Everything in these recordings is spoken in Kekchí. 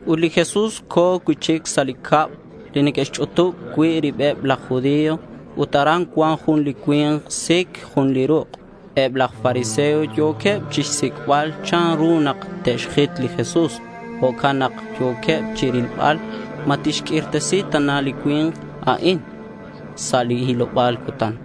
Ut li Jesús co̱ cui'chic sa' li cab li neque'xch'utub cui' ribeb laj judío. Ut aran cuan jun li cui̱nk sic jun li ruk'. Eb laj fariseo yo̱queb chixsic'bal chanru nak te'xjit li Jesús. Jo'can nak yo̱queb chirilbal ma tixq'uirtesi tana li cui̱nk a'in sa' li hiloba̱l cutan.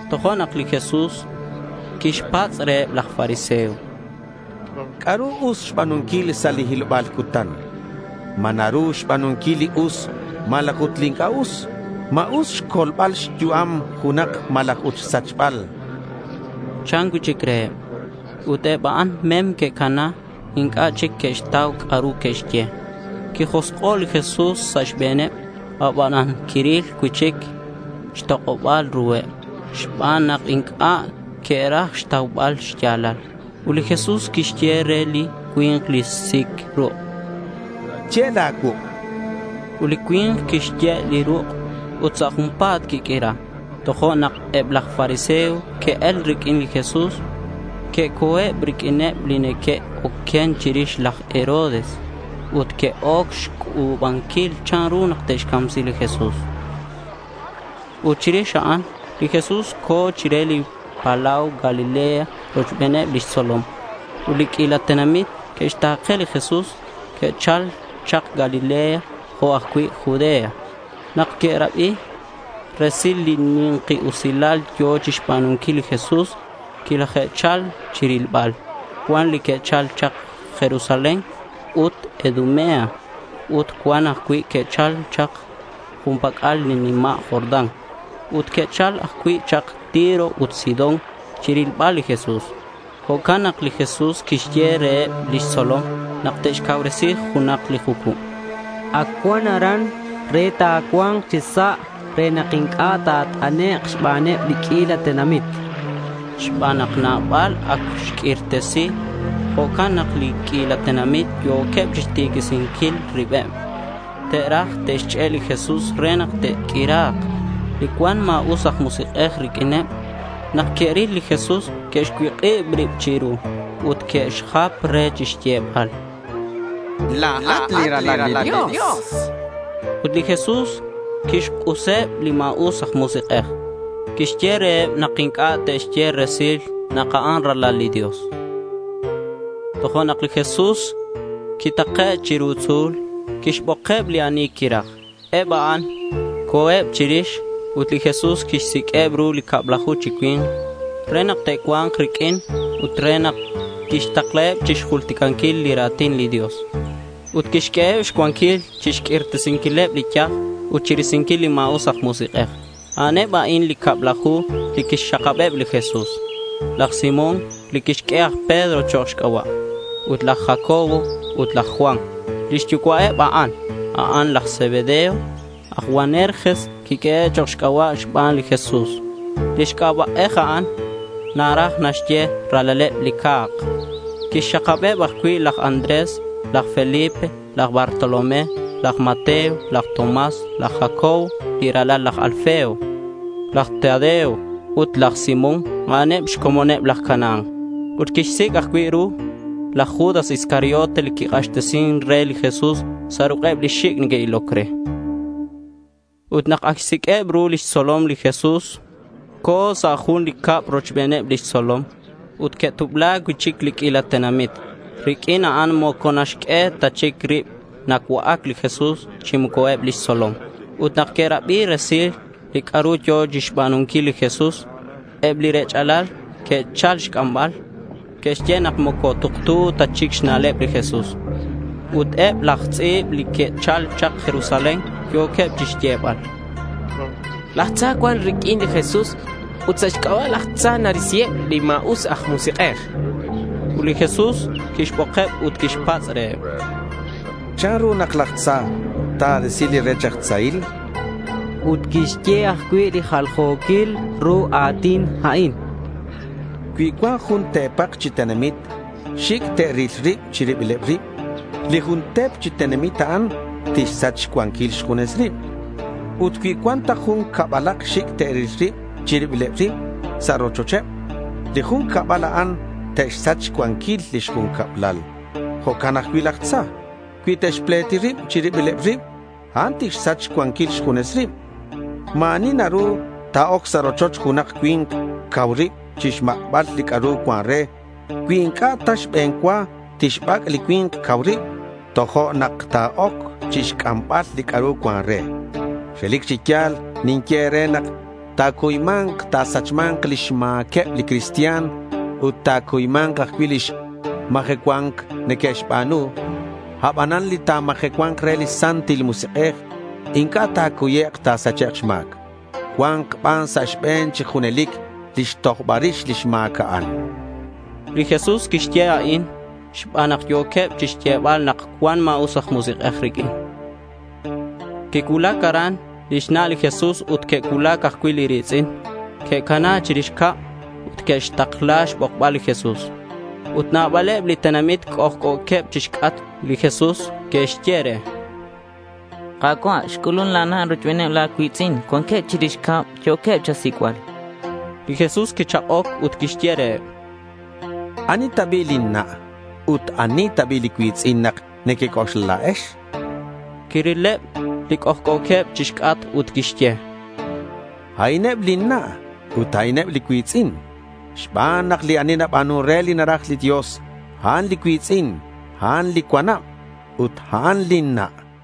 Tojo'nak li Jesús quixpatz' reheb laj fariseo: —¿C'a'ru us xba̱nunquil sa' li hiloba̱l cutan? ¿Ma naru xba̱nunquil li us malaj ut li inc'a' us? ¿Ma us xcolbal xyu'am junak malaj ut xsachbal? chan cui'chic reheb. Ut eb a'an mem que'cana. Inc'a' chic que'xtau c'a'ru que'xye. Quijosk'o' li Jesús sa' xbe̱neb, abanan quiril cui'chic xtok'oba̱l ruheb xban nak inc'a' que'raj xtaubal xya̱lal. Ut li Jesús quixye re li cui̱nk li sic ruk': —Ye' la̱ cuuk', chan. Ut li cui̱nk quixye' li ruk' ut sa' junpa̱t quiq'uira. Tojo'nak eb laj fariseo que'el riq'uin li Jesús. Que'co̱eb riq'uineb li neque'oquen chirix laj Herodes. Ut que'oc xc'u̱banquil chanru nak te'xcamsi li Jesús. Ut chirix a'an li Jesús co̱ chire li palau Galilea rochbeneb lix tzolom. Ut li q'uila tenamit que'xta̱ke li Jesús. Que'chal chak Galilea jo' ajcui' Judea. Nak que'rabi resil li xni̱nkal usilal yo̱ chixba̱nunquil li Jesús, quilaje'chal chirilbal. Cuan li que'chal chak Jerusalén ut Idumea. Ut cuan ajcui' que'chal chak jun pac'al li nima' Jordán. Ut que'chal ajcui' chak Tiro ut Sidón chirilbal li Jesús. Jo'can nak li Jesús quixye reheb lix tzolom nak te'xcauresi junak li jucub. Ac cua̱nk aran re ta̱cua̱nk chi sa' re nak inc'a' ta̱nat'ek' xbaneb li q'uila tenamit. Xban nak nabal ac xq'uirtesi, jo'can nak li q'uila tenamit yo̱queb chixtiquisinquil ribeb. Te'raj te'xch'e' li Jesús re nak te'q'uira̱k. Li cuan ma̱us aj musik'ej riq'uineb, nak que'ril li Jesús, que'xcuik'ib rib chiru ut que'xjap re chixyebal: —La̱at li Ralal li Dios, chanqueb re. Ut li Jesús quixk'useb li ma̱us aj musik'ej ut quixye reheb nak inc'a' te'xye resil nak a'an Ralal li Dios. Tojo'nak li Jesús quitake' chiru tzu̱l. Quixbokeb li ani quiraj ut eb a'an co̱eb chirix. Ut li Jesús quixsiq'ueb ru li cablaju chi cui̱nk re nak te'cua̱nk riq'uin ut re nak tixtaklaheb chixjulticanquil li ra̱tin li Dios. Ut quixq'ueheb xcuanquil chixq'uirtesinquileb li yaj ut chirisinquil li ma̱us aj musik'ej. A'aneb a'in li cablaju li quixxakabeb li Jesús: laj Simón li quixq'ue aj Pedro chok' xc'aba', ut laj Jacobo ut laj Juan. Lix yucua'eb a'an, a'an laj Zebedeo. Aj Boanerges quiq'uehe' chok' xc'aba'eb xban li Jesús. Li c'aba'ej a'an naraj naxye “Ralaleb li Ca̱k”. Quixxakabeb ajcui' laj Andrés, laj Felipe, laj Bartolomé, laj Mateo, laj Tomás, laj Jacobo li ralal laj Alfeo, laj Tadeo ut laj Simón. A'an xcomoneb laj Canaán. Ut quixsic' ajcui' ru laj Judas Iscariote li quik'axtesin re li Jesús sa' ruk'eb li xic' neque'iloc re. Ut nak ac xsiq'ueb ru lix tzolom li Jesús co̱ sa' jun li cab rochbeneb lix tzolom. Ut que'tubla cui'chic li q'uila tenamit; riq'uin a'an moco naxq'ue ta chic rib nacua'ac li Jesús chi moco eb lix tzolom. Ut nak que'rabi resil li c'a'ru yo̱ chixba̱nunquil li Jesús, eb li rech'alal que'chal chixc'ambal. Que'xye nak moco tuktu ta chic xna'leb li Jesús. Ut eb laj tz'i̱b li que'chal chak Jerusalén yo̱queb chixyebal: —Laj Tza cuan riq'uin li Jesús ut sa' xc'aba' laj Tza narisiheb li ma̱us aj musik'ej, chanqueb. Ut li Jesús quixbokeb ut quixpatz' reheb: —¿Chanru nak laj Tza ta̱risi li rech aj tzahil?— Ut quixye ajcui' li jaljo̱quil ru a̱tin a'in: —Cui cuan jun te̱pak chi tenamit xic' te'ril rib chi ribileb rib, li jun te̱p chi tenamit a'an tixsach xcuanquil xjunes rib. Ut cui cuan ta jun cabalak xic' te'ril rib chi ribileb rib sa' rochocheb, li jun cabal a'an te'xsach xcuanquil lix jun cablal. Jo'can ajcui' laj Tza cui te'xpleti rib chi ribileb rib, a'an tixsach xcuanquil xjunes rib. Ma̱ ani naru ta̱oc sa' rochoch junak cui̱nk cau rib chixmak'bal li c'a'ru cuan re, cui inc'a' ta xbe̱n cua tixbac' li cui̱nk cau rib, tojo'nak ta̱oc chixc'ambal li c'a'ru cuan re. Relic chi ya̱l ninye e̱re nak ta̱cuyma̱nk ta̱sachma̱nk lix ma̱queb li cristian ut ta̱cuyma̱nk ajcui' li majecua̱nc neque'xba̱nu. Abanan li ta̱majecua̱nk re li Santil Musik'ej, inc'a' ta̱cuyek' ta̱sachek' xma̱c. Cua̱nk ban sa' xbe̱n chi junelic lix tojbal rix li ma̱c a'an.— Li Jesús quixye a'in xban nak yo̱queb chixyebal nak cuan ma̱us aj musik'ej riq'uin. Quicuulac aran lix na' li Jesús ut que'cuulac ajcui' li ri̱tz'in. Que'cana chirix cab ut que'xtakla xbokbal li Jesús. Ut nabaleb li tenamit c'ojc'o̱queb chixc'atk li Jesús. Que'xye re: —Ka̱cua', xc'ulun la̱ na' rochbeneb la̱ cui̱tz'in. Cuanqueb chirix cab. Yo̱queb cha̱sic'bal, chanqueb. Li Jesús quichak'oc ut quixye reheb: —¿Ani ta bi' lin na'? Ut, ¿ani ta bi' li cui̱tz'in nak nequec'oxla la̱ex?— Quirileb li c'ojc'o̱queb chixc'atk ut quixye: —A'ineb lin na' ut a'ineb li cui̱tz'in. Xban nak li ani naba̱nun re li naraj li Dios, a'an li cui̱tz'in, a'an li cuanab, ut a'an lin na', chan.